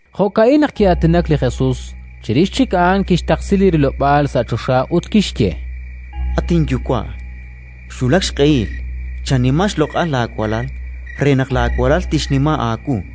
Jo'ka'in naq ki'aatinak li Jesus. Chirix chik a'an kixtaqsi li rilob'aal sa' choxa ut kixye: “At inYuwa', xwulak xq'ehil. Chanima xloq'al laawalal re naq laawalal tixnima aawu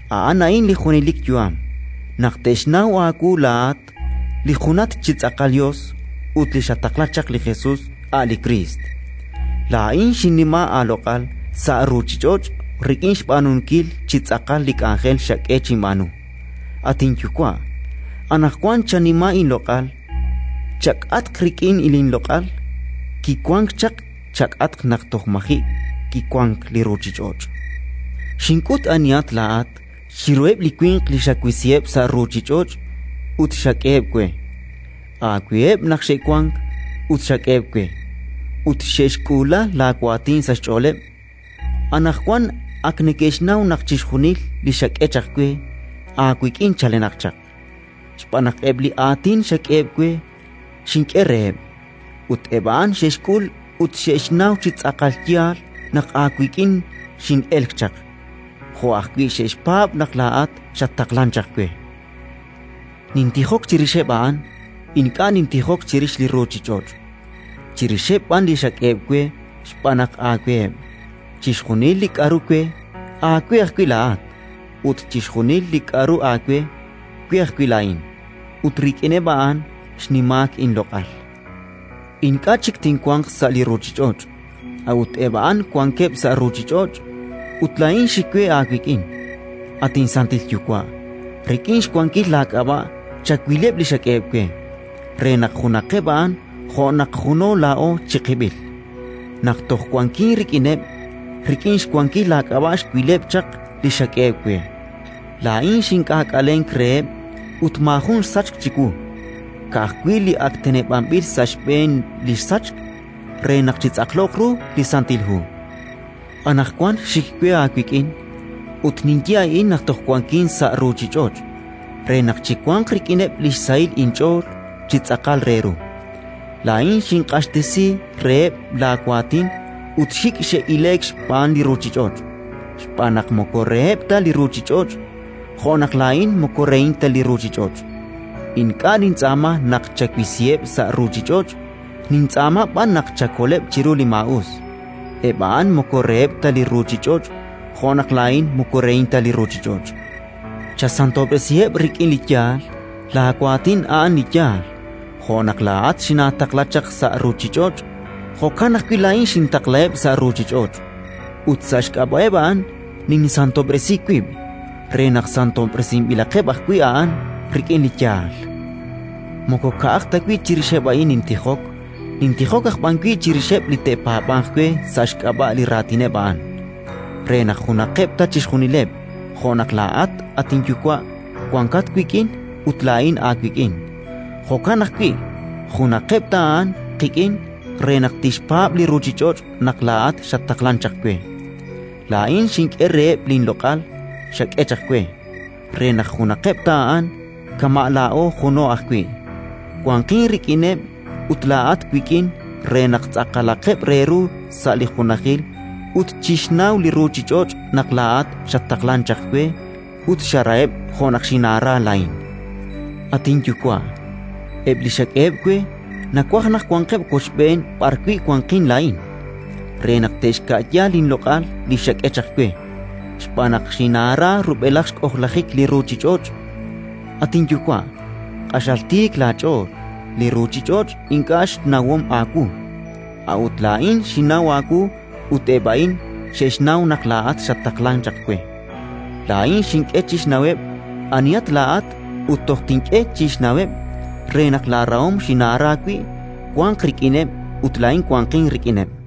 A'an a'in li junelik yu'am: naq te'xnaw aawu laa'at li junat chi tz'aqal Yos ut li xataqla chaq, li Jesus a' li Kriist. “Laa'in xinnima aaloq'al sa' ruuchich'och' rik'in xb'aanunkil chi tz'aqal li k'anjel xak'e chinb'aanu. At inYuwa', anaqwan chanima inloq'al chak'atq rik'in linloq'al kiwank chaq chak'atq naq toj maji' kiwank li ruuchich'och'. “Xink'ut anihat laa'at chiruheb' li winq li xawisiheb' sa' ruuchich'och' ut xak'eheb' we. Aaweheb' naq xe'wank ut xak'eheb' we, ut xe'xk'uula laawaatin sa' xch'ooleb'. Anaqwan ak neke'xnaw naq chixjunil li xak'e chaq we, aawik'in chalenaq chaq, xb'aan naq eb' li aatin xak'eheb' we xink'e reheb', ut eb' a'an xe'xk'ul ut xe'xnaw chi tz'aqal yaal naq aawik'in xin'elk chaq, jo' ajwi' xe'xpaab' naq laa'at xattaqlank chaq we. “Nintijok chirixeb' a'an; ink'a' nintijok chirix li ruuchich'och', chirixeb' b'an li xak'eheb' we xb'aan naq aaweheb'. Chixjunil li k'aru we, aawe ajwi' laa'at, ut chixjunil li k'aru aawe, we ajwi' laa'in; ut rik'ineb' a'an xnimaak inloq'al. “Ink'a' chik tinwanq sa' li ruuchich'och', a'ut eb' a'an wankeb' sa' ruuchich'och', ut laa'in xik we aawik'in. At inSantil Yuwa', rik'in xwankil laak'ab'a' chawileb' li xak'eheb' we, re naq junaqeb' a'an jo' naq juno laa'o chiqib'il. Naq toj wankin rik'ineb', rik'in xwankil laak'ab'a' xwileb' chaq li xak'eheb' we. Laa'in xink'aak'alenk reheb' ut maajun xsachk chiwu, ka'ajwi' li ak teneb'anb'il sa' xb'een li sachk, re naq chitz'aqloq ru li Santil Hu. “Anaqwan xik we aawik'in; ut ninye a'in naq toj wankin sa' ruuchich'och' re naq chiwanq rik'ineb' li xsahil inch'ool chi tz'aqal re ru. Laa'in xinq'axtesi reheb' laawaatin ut xik' xe'ile'k xb'aan li ruuchich'och', xb'aan naq moko reheb' ta li ruuchich'och', jo' naq laa'in moko rehin ta li ruuchich'och'. Ink'a' nintz'aama naq chawisiheb' sa' ruuchich'och', nintz'aama b'an naq chakoleb' chiru li maa'us. Eb' a'an moko reheb' ta li ruuchich'och', jo' naq laa'in moko rehin ta li ruuchich'och'. Chasantob'resiheb' rik'in li yaal: laawaatin a'an li yaal. Jo' naq laa'at xinaataqla chaq sa' ruuchich'och', jo'kan ajwi' laa'in xintaqlaheb' sa' ruuchich'och'. Ut sa' xk'ab'a'eb' a'an ninsantob'resi wib', re naq santob'resinb'ilaqeb' ajwi' a'an rik'in li yaal. “Moko ka'aj ta wi' chirixeb' a'in nintijok, nintijok aj b'an wi' chirixeb' li te'paab'anq we sa' xk'ab'a' li raatineb' a'an, re naq junaqeb' ta chixjunileb'. Jo' naq laa'at, at inYuwa', wankat wik'in ut laa'in aawik'in, jo'kan ajwi' junaqeb' ta a'an qik'in re naq tixpaab' li ruuchich'och' naq laa'at xattaqlank chaq we. Laa'in xink'e reheb' linloq'al xak'e chaq we, re naq junaqeb' ta a'an, kama' laa'o juno ajwi': wanqin rik'ineb' ut laa'at wik'in re naq tz'aqalaqeb' re ru sa' li junajil ut chixnaw li ruuchich'och' naq laa'at xattaqlank chaq we ut xaraheb' jo' naq xinaara laa'in. “At inYuwa', eb' li xak'eheb' we nawaj naq wanqeb' wochb'een b'arwi' wanqin laa'in, re naq te'xka'ya linloq'al li xak'e chaq we, xb'aan naq xinaara rub'elaj xk'ojlajik li ruuchich'och'. “At inYuwa', q'axal tiik laach'ool, li ruuchich'och' ink'a' xnawom aawu; a'ut laa'in xinnaw aawu ut eb' a'in xe'xnaw naq laa'at xattaqlank chaq we. Laa'in xink'e chixnaweb' anihat laa'at ut toj tink'e chik chixnaweb', re naq laarahom xinaara wi' wanq rik'ineb' ut laa'in wanqin rik'ineb'”.